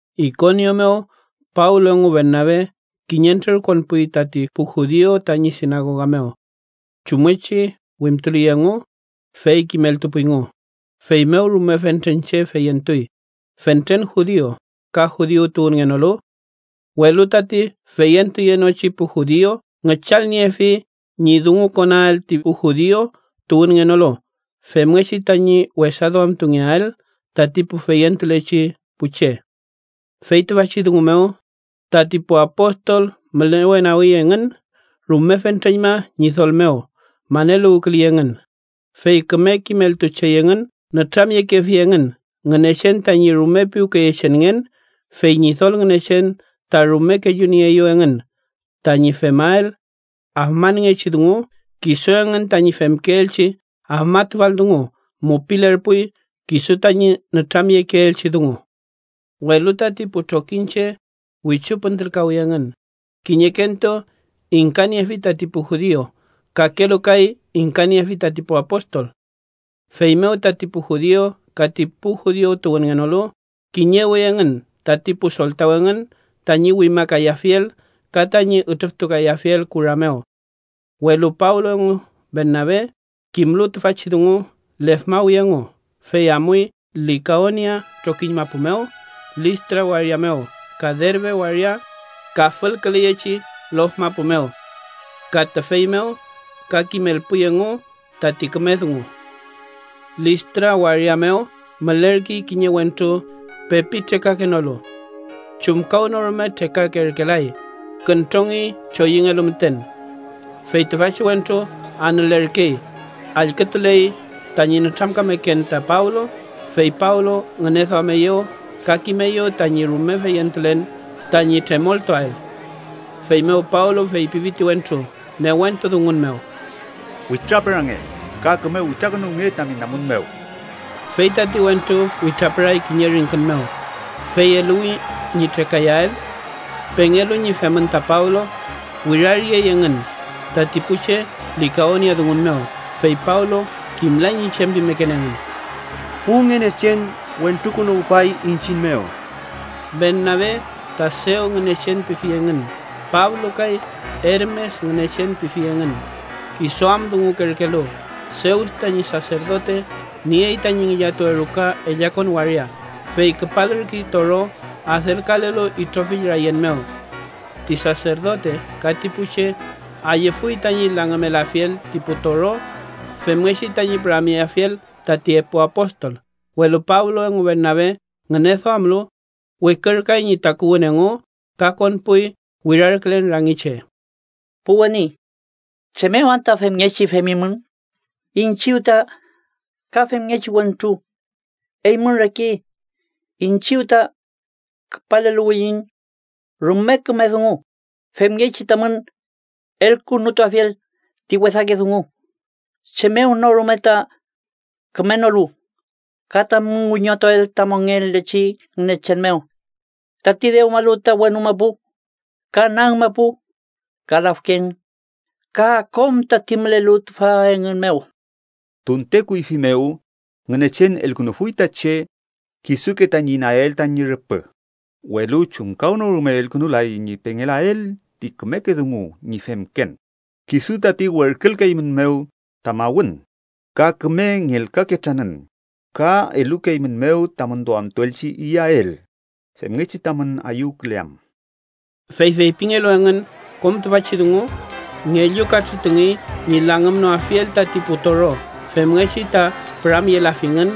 Ikonio mew Pablo engu Bernabe kiñentrür konpuy tati pu judiu tañi sinagoga mew chumngechi wimtuley engu, fey kimeltupuyngu, feymew rume fentren che feyentuy, fentren judiu ka judiu tuwünngenolu. Welu tati feyentuyenochi pu judiu ngüchalniefi ñi dungukonael ti pu judiu tuwünngenolu femngechi tañi wesaduamtungeael tati pu feyentulechi pu che. Fey tüfachi dungu mew, tati pu apostol mülewenagi engün rume fentreñma Ñidol mew maneluwküley engün, fey küme kimeltuchey engün. Nütramyekefi engün Ngünechen tañi rume piwkeyechenngen, fey Ñidol Ngünechen ta rume kellunieeyew engün tañi femael afmanngechi dungu. Kisu engün tañi femkeelchi afmatufal dungu mupilerpuy kisu tañi nütramyekeelchi dungu. Welu tati pu trokiñche wichu püntülkawi engün, kiñekentu ingkaniefi tati pu judiu, kakelu kay ingkaniefi tati pu apostol. Feymew, tati pu judiu ka ti pu judiu tuwünngenolu kiñewi engün tati pu soltaw engün tañi wimakayafiel ka tañi ütrüftukayafiel kura mew. Welu Pablo engu Bernabe kimlu tüfachi dungu, lefmawi engu, fey amuy Likaonia trokiñ mapu mew, Listra waria mew ka Derbe waria ka fülküleyechi lof mapu mew. Ka tüfey mew ka kimelpuy engu tati küme dungu. Listra waria mew mülerkey kiñe wentru pepi trekakenolu. Chumkawnorume trekakerkelay, küntrongey choyüngelu müten. Fey tüfachi wentru anülerkey, allkütuley tañi nütramkameken ta Pablo, fey Pablo ngüneduameyew ka kimeyew tañi rume feyentulen tañi tremoltuael. Feymew Pablo feypifi ti wentru newentu dungun mew: —¡Witrapürange ka küme witrakünuwnge tami namun mew! Fey tati wentru witrapüray kiñe ringkün mew, fey eluwi ñi trekayael. Pengelu ñi femün ta Pablo, wiraryey engün tati pu che likaoniadungun mew (fey Pablo kimlay ñi chem pimeken engün): —¡Pu ngünechen wentrukünuwpay iñchiñ mew! Bernabe ta Seus ngünechen pifi engün, Pablo kay Ermes ngünechen pifi engün kisu am dungukerkelu. Seus tañi saserdote niey tañi ngillatuwe ruka ellakon waria, fey küpalürkey toro adelkalelu itrofill rayen mew. Ti saserdote ka ti pu che ayüfuy tañi langümelafiel ti pu toro, femngechi tañi püramyeafiel tati epu apostol. Welu Pablo engu Bernabe ngüneduamlu, wikürkay ñi takuwün engu ka konpuy wirarkülen rangi che: —Pu weni, ¿chem mew anta femngechi femimün? Iñchiw ta ka femngechi wentru, eymün reke. Iñchiw ta küpaleluwiyiñ rume küme dungu femngechi tamün elkünutuafiel ti wesake dungu, chem mew no rume ta kümenolu, ka tamün wiñotuael ta mongelechi Ngünechen mew, tati dewmalu ta wenu mapu, ka nag mapu, ka lafken ka kom tati mülelu tüfa engün mew. Tunte kuyfi mew ta Ngünechen elukünufuy ta che kisuke tañi inayael tañi rüpü, welu chumkawnorume elkünulay ñi pengelael ti kümeke dungu ñi femken, kisu tati werkülkeeymünmew ta mawün ka küme ngelkaketranün ka elukeeymünmew tamün duamtuelchi iyael, femngechi tamün ayüwküleam. Fey feypingelu engün kom tüfachi dungu, ngellu katrütungey ñi langümnoafiel tati pu toro femngechi ta püramyelafingün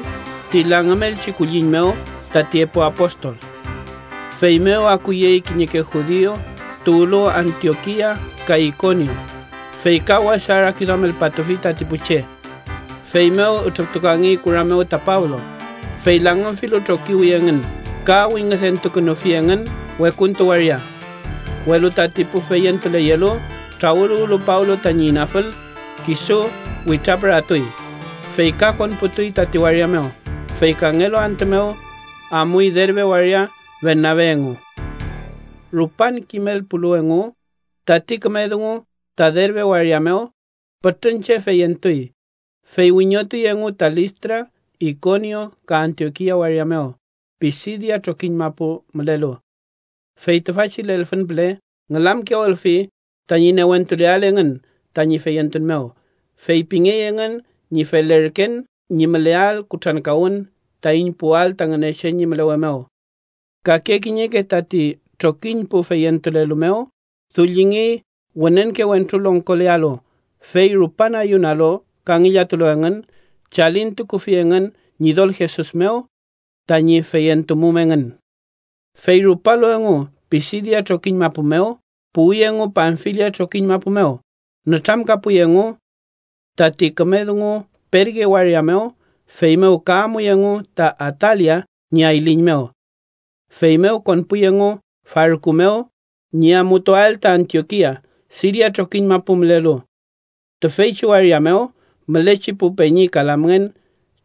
ti langümelchi kulliñ mew tati epu apostol. Feymew akuyey kiñeke judiu tuwlu Antiokia ka Ikonio, fey ka wesa rakiduamelpatufi tati pu che. Feymew ütrüftukangey kura mew ta Pablo, fey langümfilu trokiwi engün ka wingüdentukünufi engün wekuntu waria. Welu tati pu feyentuleyelu trawüluwlu Pablo tañi inafül, kisu witrapüratuy, fey ka konputuy tati waria mew. Fey kangelu antü mew, amuy Derbe waria Bernabe engu. Rupan kimelpulu engu tati küme dungu ta Derbe waria mew, pütrün che feyentuy, fey wiñotuy engu ta Listra, Ikonio ka Antiokia waria mew Pisidia trokiñ mapu mülelu. Fey tüfachi lelfün püle ngülamkiyawülfi tañi newentuleael engün tañi feyentun mew. Feypingey engün ñi felerken ñi müleael kutrankawün taiñ puwael ta Ngünechen ñi mülewe mew. Kake kiñeke tati trokiñ pu feyentulelu mew dullingey wünenke wentru longkolealu, fey rupan ayunalu ka ngillatulu engün, chalintukufi engün Ñidol Jesus mew, tañi feyentumum engün. Fey rupalu engu Pisidia trokiñ mapu mew, puwi engu Panfilia trokiñ mapu mew. Nütramkapuy engu tati küme dungu Perge waria mew, feymew ka amuy engu ta Atalia ñi ayliñ mew. Feymew konpuy engu farku mew ñi amutuael ta Antiokia, Siria trokiñ mapu mülelu. Tüfeychi waria mew mülechi pu peñi ka lamngen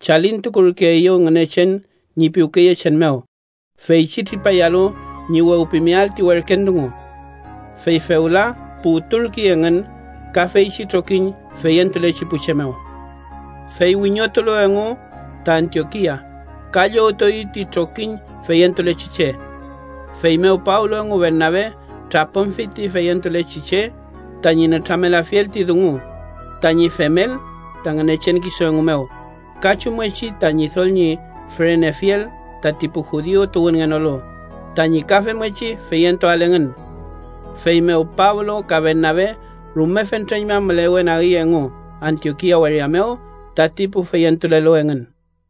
chalintukurkeeyew Ngünechen ñi piwkeyechen mew feychi tripayalu ñi wewpimeael ti werken dungu. Fey fewla puwturkey engün ka feychi trokiñ feyentulechi pu che mew. Fey wiñotulu engu ta Antiokia, ka llowtueyew ti trokiñ feyentulechi che. Feymew Pablo engu Bernabe trapümfi ti feyentulechi che tañi nütramelafiel ti dungu tañi femel ta Ngünechen kisu engu mew, ka chumngechi ta Ñidol ñi fürenefiel tati pu judiu tuwünngenolu tañi ka femngechi feyentuael engün. Feymew Pablo ka Bernabe rume fentreñma mülewenagi engu Antiokia waria mew tati pu feyentulelu engün.